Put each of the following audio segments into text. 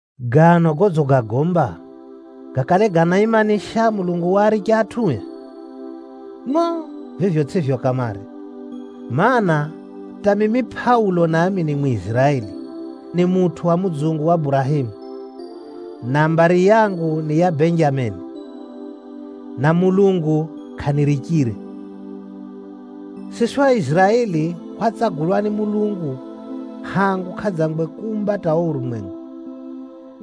Gano godzigagomba, gakale ganaimanisha Mulungu waaricha atʼue? Ngʼo! Vivyo tsʼivyo kamare! Maana, hata mimi Pʼaulo nami ni Mwiziraeli, ni mutʼu wa mudzungu wa Burahemu, na mbari yangu ni ya Benjameni, na Mulungu kʼanirichire. Siswi Aiziraeli hwatsagulwa ni Mulungu hangu kʼadzangwe kuumba hata o urumwengu,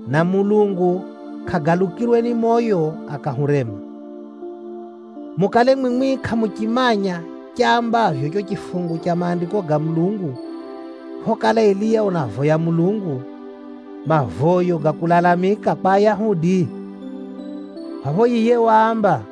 na Mulungu kʼagalukirwe ni moyo akahurema. Mukale mwimwi kʼamuchimanya chambavyo cho chifungu cha Maandiko ga Mulungu phokala Eliya unavoya Mulungu, mavoyo ga kulalamika kwa Ayahudi? Phapho yiye waamba,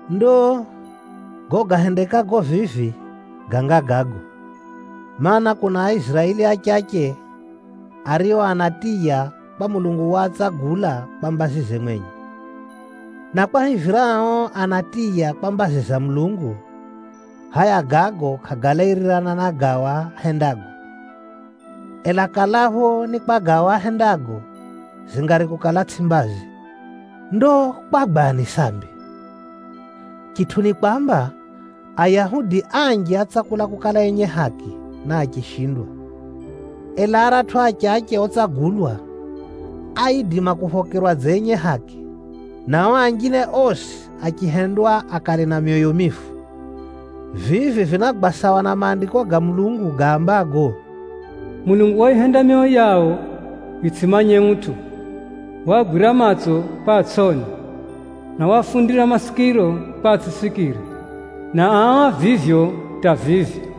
Ndo, gago gahendekago vivi ganga gago, mana, kuna Aiziraeli achache ario anatiya kwa Mulungu waatsagula kwa mbazize mwenye. Na kwahivira ao anatiya kwa mbazi za Mulungu, hʼaya gago kʼagalairirana na gao ahendago. Ela kalapho ni kwa gao ahendago, zingari kukala tsʼi mbazi. Ndo kwagwani sambi? Chitʼu ni kwamba, Ayahudi anji átsakula kukala enye haki, na achishindwa. Ela aratʼu achache otsagulwa, áidima kuphokerwa dza enye haki, na o anjine osi achihendwa akale na myoyo mifu. Vivi vinagwa sawa na Maandiko ga Mulungu gaambago, “Mulungu wayihenda myoyo yao yitsʼimanye utʼu, waagwira matso kwa atsʼone, na waafundira masikiro kwa atsʼisikire, na ao a vivyo hata vivi.”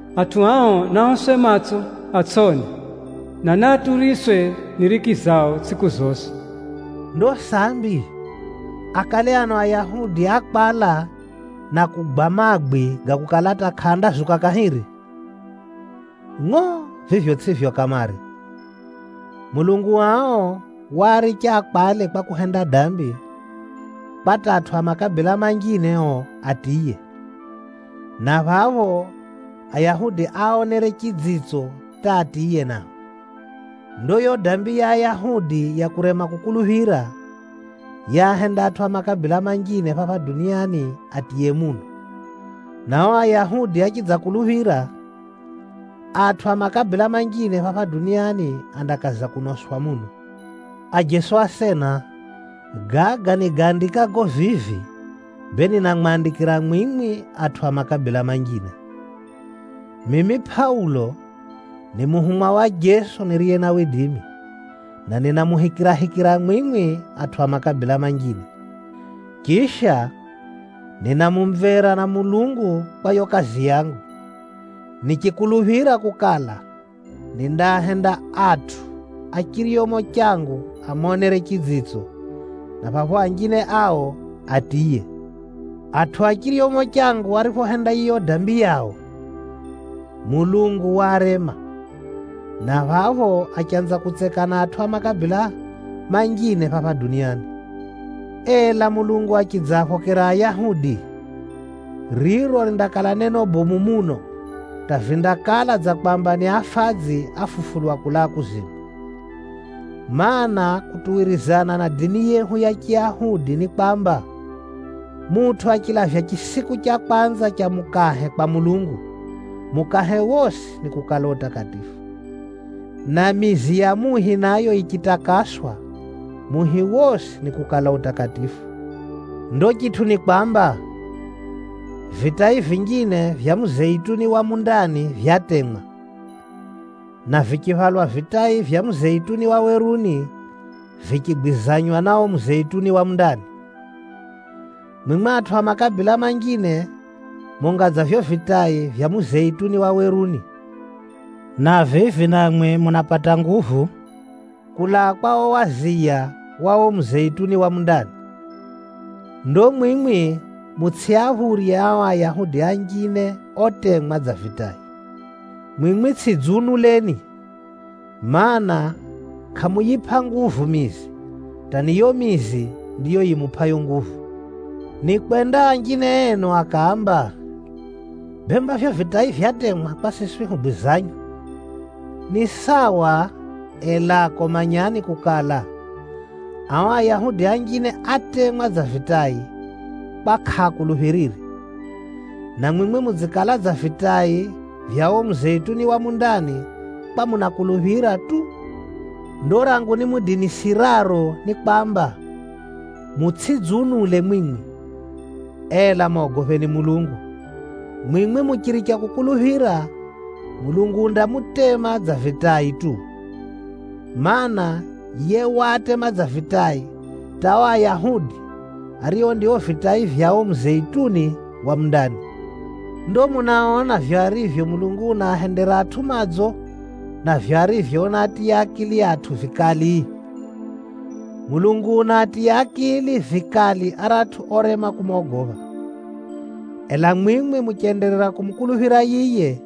Matso gao nagatiywe dziza kwa hata atsʼone, na naaturiswe ni riki tsʼiku zosi.” Ndo sambi, akale ano Ayahudi ákwala na kugwa magwi ga kukala hata kʼaandazuka kahiri? Ngʼo! Vivyo tsʼivyo kamare! Mulungu ao waaricha akwale kwa kuhenda dambi, kwa hata atʼu a makabila manjine o atiye, na phapho Ayahudi aaonere chidzitso hata atiye nao. Ndo yo dambi ya Ayahudi ya kurema kukuluphira, yaahenda atʼu a makabila manjine phapha duniani atiye muno. Na o Ayahudi achidzakuluphira, atʼu a makabila manjine phapha duniani andakaza kunoswa muno. Ajeso asena, gaga nigaandikago vivi, bee ninamwandikira mwimwi atʼu a makabila manjine. Mimi Pʼaulo ni muhumwa wa Jeso, na ninamuhikirahikira mwimwi atʼu a makabila manjine. Chisha, nina mumvera na Mulungu kwa yo kazi yangu, nichikuluphira kukala, nindaahenda atʼu a chiryomo changu amonere chidzitso, na phapho anjine ao atiye. Atʼu a chiryomo changu ariphohenda yiyo dambi yao, Mulungu waarema, na phapho achanza kutseka na atʼu a makabila manjine phapha duniani. Ela Mulungu achidzaaphokera Ayahudi, riro rindakala neno bomu muno hata vindakala dza kwamba ni afadzi áfufulwa kulaa kuzimu. Maana, kutuwirizana na dini yehu ya Chiyahudi ni kwamba, mutʼu achilavya chisiku cha kwanza cha mukahe kwa Mulungu, mukahe wosi nikukala utakatifu. Na mizi ya muhi nayo yichitakaswa, muhi wosi nikukala utakatifu. Ndo chitʼu ni kwamba, vitai vinjine vya muzeituni wa mundani vyatemwa, na vichihwalwa vitai vya muzeituni wa weruni vichigwizanywa na o muzeituni wa mundani. Mwimwi atʼu a makabila manjine munga dza vivyo vitai vya muzeituni wa weruni, na vivi namwi munapata nguvu kulaa kwa o waziya wa o muzeituni wa mundani. Ndo mwimwi mutsʼiaphurye ao Ayahudi anjine otemwa dza vitai. Mwimwi tsʼidziunuleni, mana, kʼamuyipʼa nguvu mizi, hata ni yo mizi ndiyo yimupʼayo nguvu. Nikwenda anjine enu akaamba, “Bemba vivyo vitai vyatemwa kwa siswi hugwizanywe.” Ni sawa, elako manyani kukala, ao Ayahudi anjine átemwa dza vitai kwa kʼaakuluphirire, na mwimwi mudzikala dza vitai vya o muzeituni wa mundani kwa munakuluphira tu. Ndo rangu nimudinisiraro ni kwamba, mutsʼidziunule mwimwi, ela mogopheni Mulungu. Mwimwi muchiricha kukuluphira, Mulungu undamutema dza vitai tu. Maana, yiye waatema dza vitai hata o Ayahudi ario ndio vitai vya o muzeituni wa mundani. Ndo munaona vivyo arivyo Mulungu unaahendera atʼu madzo, na vivyo arivyo unaatiya akili atʼu vikali? Mulungu unaatiya akili vikali aratʼu orema kumogopha. Ela mwimwi muchenderera kumukuluphira yiye,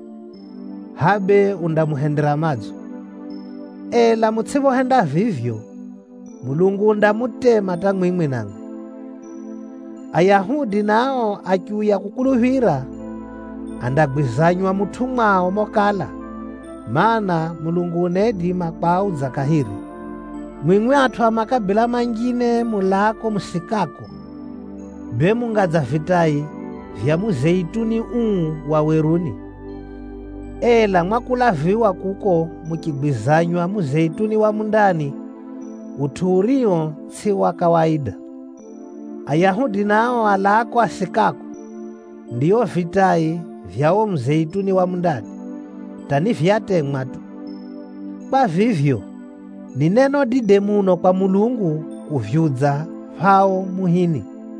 hʼa bee undamuhendera madzo. Ela mutsʼiphohenda vivyo, Mulungu undamutema hata mwimwi namwi. Ayahudi nao achiuya kukuluphira, andagwizanywa mutʼu mwao mokala, mana, Mulungu unaidima kwaudza kahiri. Mwimwi atʼu a makabila manjine mulaako musikako, bee munga dza vitai vya muzeituni uu wa weruni. Ela mwakulaviwa kuko muchigwizanywa muzeitunini wa mundani, utʼu urio tsʼi wa kawaida. Ayahudi nao alaako asikako, ndio vitai vya o muzeituni wa mundani, hata ni vyatemwa tu. Kwa vivyo, ni neno dide muno kwa Mulungu kuvyudza phao muhini.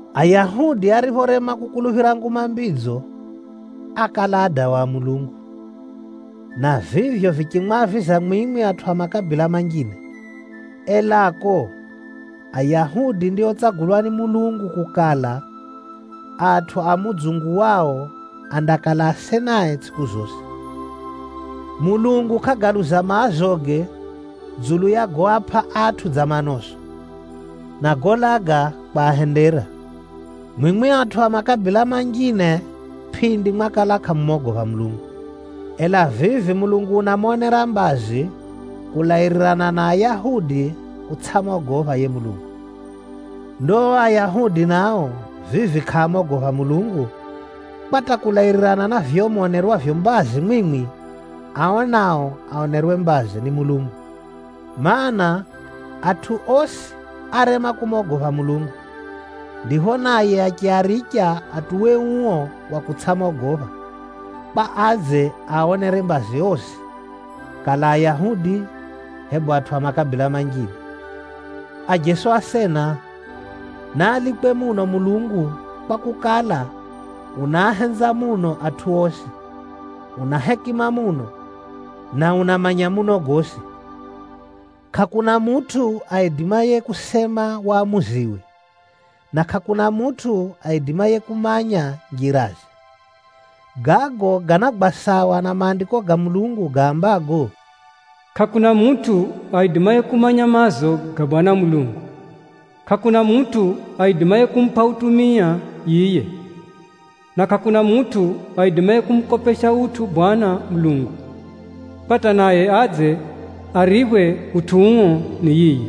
Ayahudi ariphorema kukuluphira Nguma Mbidzo, ákala adawa a Mulungu, na vivyo vichimwaviza mwimwi atʼu a makabila manjine. Elako, Ayahudi ndiotsagulwa ni Mulungu kukala, atʼu a mudzungu wao andakala asenae tsʼiku zosi. Mulungu kʼagaluza maazoge dzulu ya goapʼa atʼu dza manoso, na golaga kwahendera. Mwimwi atʼu a makabila manjine pʼindi mwakala kʼamumogopha Mulungu. Ela vivi Mulungu unamonera mbazi kulairirana na Ayahudi kutsʼamogopha yiye Mulungu. Ndo o Ayahudi nao vivi kʼaamogopha Mulungu, kwa hata kulairirana na vivyo monerwavyo mbazi mwimwi, ao nao aonerwe mbazi ni Mulungu. Maana, atʼu osi árema kumogopha Mulungu, ndipho naye achiaricha atuwe uo wa kutsʼamogopha, kwa adze aaonere mbazi osi, kala Ayahudi, hebu atʼu a makabila manjine. Ajeso asena, naalikwe muno Mulungu, kwakukala, unaahenza muno atʼu osi, una hekima muno, na unamanya muno gosi. Kʼakuna mutʼu aidimaye kusema wamuziwe, na kʼakuna mutʼu aidimaye kumanya njiraze! Gago ganagwa sawa na Maandiko ga Mulungu gaambago, “Kʼakuna mutʼu aidimaye kumanya maazo ga Bwana Mulungu, hebu kumupʼa utumia. Na kʼakuna mutʼu aidimaye kumukopesha utʼu Bwana Mulungu, kwa hata naye adze ariphwe utʼu uo ni yiye!”